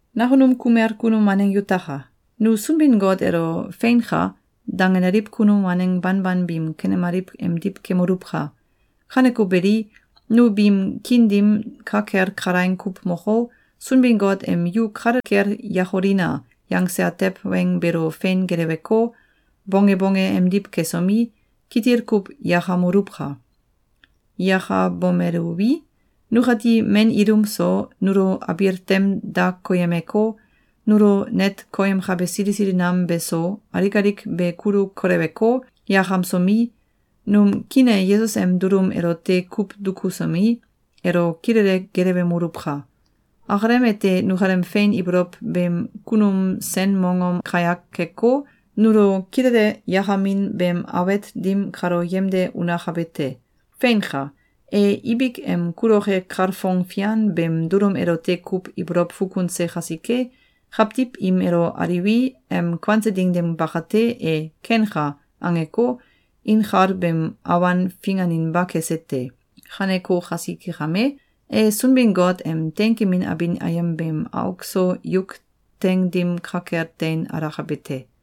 Nakunum kumel kunum waneng yutaka! Nu Sunbin-Got elo “Feinka!”, dangenaliw kunum waneng banban biim kanemaliw emdiw kemoluwka! Kaneko beli, nu biim kiin dim ka kel kalaing kuw moko, Sunbin-Got em “Yu kale kel yakolina!”, yangse atew weng beelo fein geleweko, bonge bonge emdiw kesomi, kitil kuw yakamoluwka! Yakabomeluwi, nukati men ilum so, nulo abil tem da koyemeko, nulo net koyemkabe sili sili nam beso, alik alik be kulu koleweko, yakamsomi, num kiin e Yesus em dulum elote kuw dukusomi, elo kilele gelewemoluwka! Akalem ete nukalem fein ibolow beem kunum sen mongom kayak keko, nulo kilele yakamin beem awet dim kalo yemde unakabe te. Feinka! E ibik em kuloke kalfong fian beem dulum elote kuw ibolow fukunse kasike, kawtiw im elo aliwi, em kuanse ding dim bakate, e “Kenka!”, angeko, inkal beem awan finganinba kese te. Kaneko kasike kame, e Sunbin-Got em teinkemin abin ayem beem auk so yuk teing dim ka kel tein alakabe te.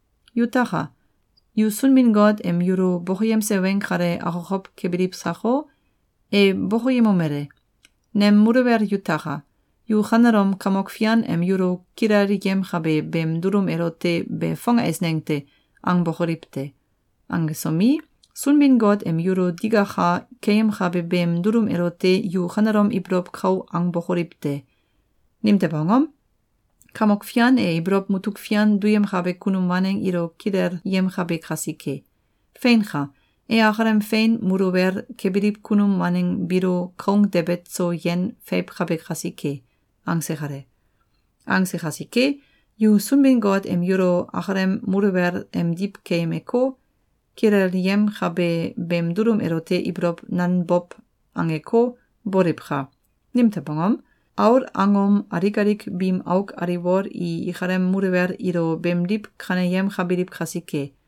Yutaka! Yu Sunbin-Got em yulo bokoyemse weng kale akokow kebiliw sako? E bokoyemomele: “Nem muluwel yutaka! Yu kanelom Kamok Fian em yulo kilelyemkabe beem dulum elote “Be fong eisneng te!”, angbokoliw te! Angesomi, Sunbin-Got em yulo digaka keyemkabe beem dulum elote yu kanelom ibolow kau angbokoliw te! Nimtew angom? Kamok Fian e ibolow mutuk fian duyemkabe kunum waneng ilo kilelyemkabe kasike. Feinka! E akalem fein muluwel kebiliw kunum waneng biilo koung debet so yen feiwkabe kasike.”, angse kale. Angse kasike, yu Sunbin-Got em yulo akalem muluwel emdiw keyemeko, kilelyemkabe beem dulum elote ibolow nanbow angeko, boliwka! Nimtew angom? Aul angom alik alik biim auk aliwol i ikalem muluwel ilo beemdiw kaneyemkabiliw kasike.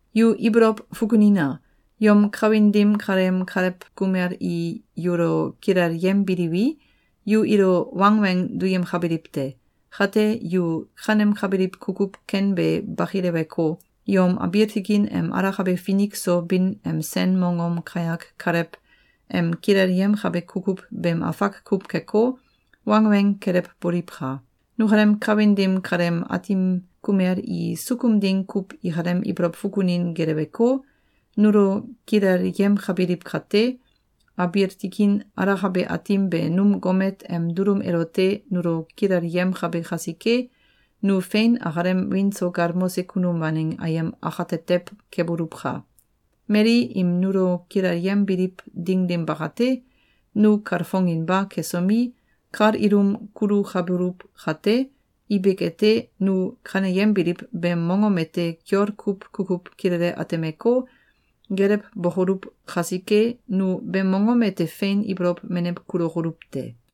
Yu ibolow fukunina! Yom kawin dim kaleem kalew kumel i yulo kilelyembiliwi, yu ilo wangweng duyemkabiliw te. Kate, yu kanemkabiliw kukuw ken be bakileweko, yom abiil tikin em alakabe finik so bin em sen mongom kayak Kalew em kilelyemkabe kukuw beem afak kuw keko, wangweng kelewboliwka! Nukalem kawin dim kaleem aatim kumel i sukum ding kuw ikalem ibolow fukunin geleweko, nulo kilelyemkabiliw kate, abiil tikin alakabe Aatim be num gomet em dulum elote nulo kilelyemkabe kasike, nu fein akalem wiin so galmose kunum waneng ayem akatetew keboluwka! Mali im nulo kilelyembiliw ding dim bakate, nu kalfonginba kesomi, kal ilum kulukabuluw kate, ibik ete, nu kaneyembiliw beem mongom ete kiol kuw kukuw kilele atemeko, gelewbokoluw kasike, nu beem mongom ete fein ibolow menew kulokoluw te.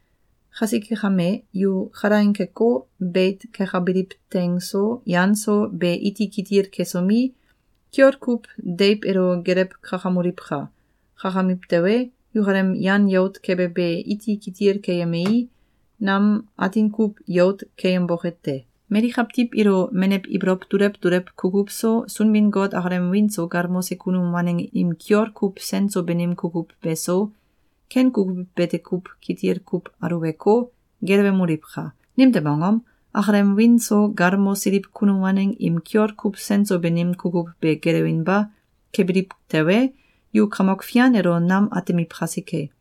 Kasike kame, yu kalaing keko, beit kekabiliw teing so, yan so, be iti kitil kesomi, kiol kuw deiw elo gelew kakamoliwka! Kakamiw tewe, yukalem yan yout kebe be iti kitil keyemei, nam atin kuw yout keyemboke te. Mali kawtiw ilo menew ibolow dulew dulew kukuw so, Sunbin-Got akalem wiin so galmose kunum waneng im kiol kuw sen so banim kukuw be so, ken kukuw bete kuw kitil kuw aluweko, gelewemoliwka! Nimtew angom? Akalem wiin so galmosiliw kunum waneng im kiol kuw sen so banim kukuw be gelewinba kebiliw tewe, yu Kamok Fian elo nam atemiw kasike.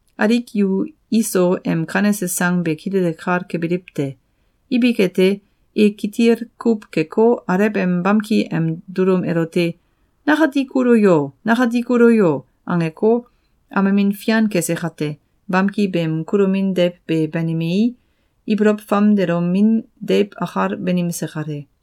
Alik yu Iso em kanese sang be kilele kal kebiliw te. Ibik ete, e kitil kuw keko, alew em bamki em dulum elote “Nakati kulo yo! Nakati kulo yo!”, angeko, amemin fian kese kate, bamki beem kulomin deiw be banimei, ibolow famdelomin deiw akal banimse kale.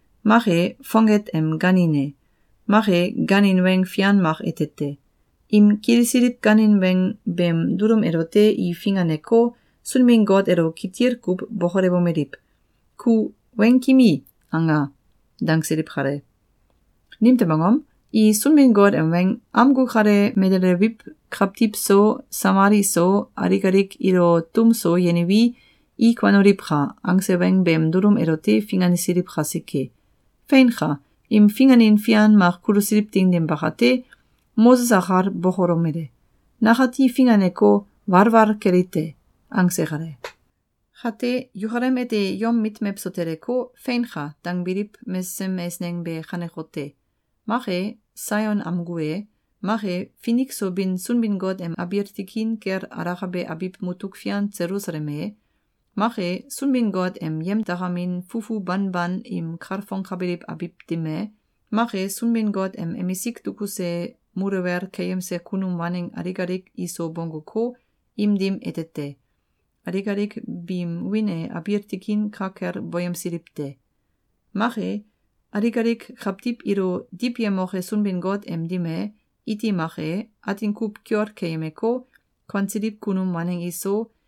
mak e, fonget em gaanin e, mak e, gaanin weng fian mak ete te. Im kilisiliw gaanin weng beem dulum elote i finganeko, Sunbin-Got elo kitil kuw bokolewomeliw: “Ku ‘Weng kimi!’, anga!”, dangsiliw kale. Nimtew angom? I Sunbin-Got em weng “Amgu kale melelewiw kawtiw so, samal iso, alik alik ilo tum so yeniwi, i kuanoliwka!”, angse weng beem dulum elote fingansiliw kasike. Feinka! Im finganin fian mak kulusiliw ding dim bakate, Moses akal bokolomele: “Nakati finganeko, walwal keli te!”, angse kale. Kate, yukalem ete yom mit mewso teleko, “Feinka!”, dangbiliw mesesem eisneng be kanekote: Mak e, Saion amgu e, mak e, finik so bin Sunbin-Got em abiil tikin kel alakabe abiw mutuk fian Selusalem e, mak e, Sunbin-Got em yemdakamin fufu banban im kalfongkabiliw abiw dim e, Mak e, Sunbin-Got em emisik dukuse muluwel keyemse kunum waneng alik alik iso bongguko, im dim ete te. (Alik alik biim wiin e abiil tikin ka kel boyemsiliw te.) Mak e, alik alik kawtiw ilo diwyemoke Sunbin-Got em dim e, iti mak e, atin kuw kiol keyemeko, kuansiliw kunum waneng iso,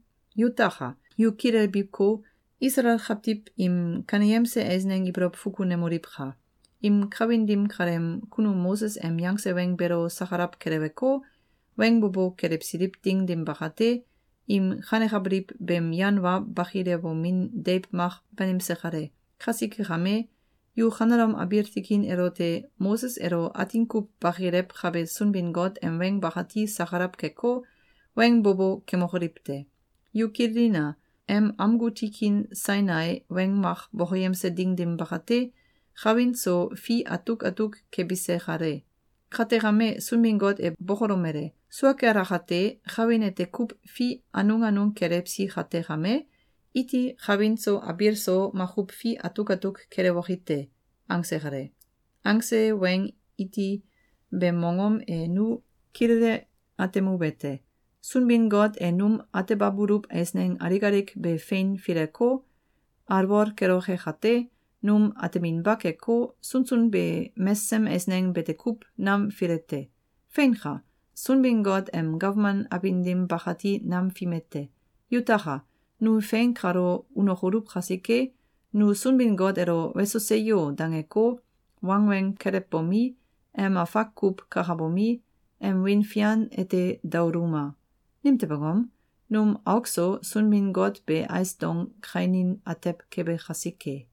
Yutaka! Yu kilelbiko, Isalael kawtiw im kaneyemse eisneng ibolow fukunemoliwka! Im kawin dim kaleem kunum Moses em yangse weng beelo sakalaw keleweko, weng bo bo kelewsiliw ding dim bakate, im kanekabiliw beem yan wa bakilewomin deiw mak banimse kale. Kasike kame, yu kanelom abiil tikin elote Moses elo atin kuw bakilewkabe Sunbin-Got em weng bakati sakalaw keko, weng bo bo kemokoliw te! Yu kililina! Em amgu tikin Sainai weng mak bokoyemse ding dim bakate, kawin so fi atuk atuk kebise kale. Kate kame, Sunbin-Got e bokolomele: “Sua kel akate, kawin ete kuw fi anung anung kelewsi kate kame, iti kawin so abiil so makuw fi atuk atuk kelewoki te!”, angse kale. Angse weng iti beem mongom e nu kilele atemuwete: Sunbin-Got e num atebabuluw eisneng alik alik be fein fileko, alwol keloke kate, num ateminba keko, sunsun be mesesem eisneng bete kuw nam file te. Feinka! Sunbin-Got em gawman abin dim bakati nam fime te. Yutaka! Nu fein kalo unokoluw kasike, nu Sunbin-Got elo “Weso! Seyo!”, dangeko, wangweng kelewbomi, em afak kuw kakabomi, em wiin fian ete daoluma! Nimtew angom? Num auk so Sunbin-Got be ais dong kainin atew kebe kasike!